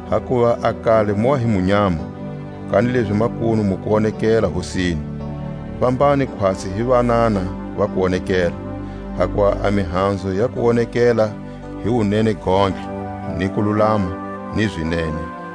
Hakuva a kale mu wa hi munyama, kanilezi makunu mu kuwonekela Hosini; fambani khwatsi hi vanana va kuwonekela, hakuva a mihanzu ya kuwonekela hi wunene gontlhe, ni kululama, ni zinene;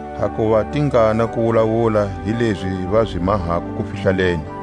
hakuva tingana ku wulawula hi lezi va zi mahako kufihlaleni.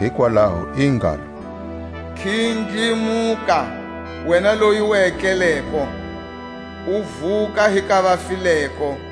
Hikwalaho i ngalo: Khindlimuka wena loyi u etleleko, u vu ka hi ka vafileko,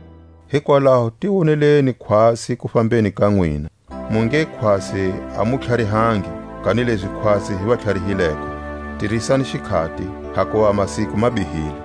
Hikwalaho ti woneleni khwatsi a kufambeni ka nwina, mu nge khwatsi a mu tlharihangi, kanilezi khwatsi hi vatlharihileko. Tirisani xikhati, hakuva masiku ma bihile.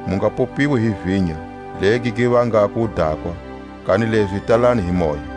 Mu nga popiwi hi vinya, legi gi vangako wudakwa, kanilezi tatani hi Moya,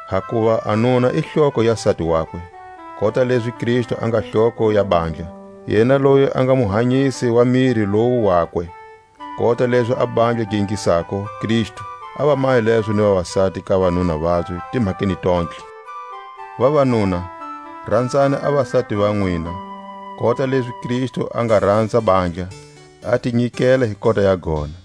Hakuva a nuna i hloko ya sati wakwe, kota lezi Kristu a nga hloko ya bandla, yena loyi a nga Muhanyisi wa miri lowu wakwe. Kota lezi a bandla gi ingisako Kristu, a va mahe lezo ni vasati ka vanuna vabye timhakeni tontlhe. Vavanuna, ranzani a vasati va nwina, kota lezi Kristu a nga ranza bandla, a ti nyikela hi kota ya gona,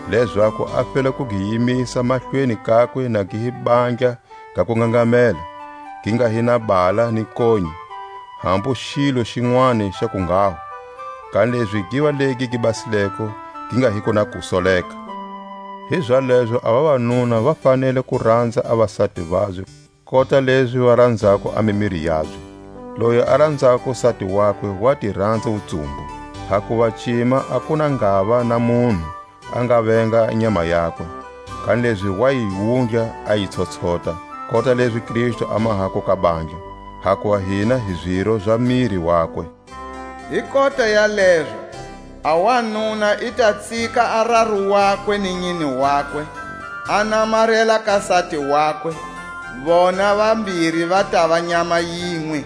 lezaku a fela ku gi yimisa mahlweni kakwe na gi hi bandla ga kungangamela, gi nga hi na hala ni nkonyi, hambu xilo xinwani xa kunghaho; kanilezi giva legi gi basileko gi nga hiko na kusoleka. Hizalezo a vavanuna va fanele ku ranza a vasati vabye kota lezi va ranzako a mimiri yabye. Loyi a ranzako sati wakwe wa ti ranza wutsumbu. Hakuva cima a ku na ngava na munhu a nga venga a nyama yakwe; kanilezi wa yi wundla a yi tshotshota, kota lezi Kristu a mahako ka bandla, hakuva hina hi ziro za miri wakwe. Hi kota ya lezo a wanuna i ta tsika a raru wakwe ni nyine wakwe, a namarela ka sati wakwe; vona vambiri va tava nyama yinwe.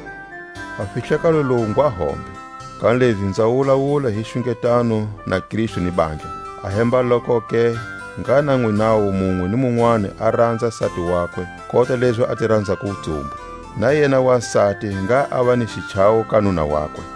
A fihlakalo lowu ngwa hombe; kanilezi nza wulawula hi xungetano na Kristu ni bandla. Ahembalokoke ngha na nwinawu munwe ni munwani a ranza sati wakwe kota lezi a ti ranzako wutsumbu; na yena wasati ngha ava ni xichawo ka nuna wakwe.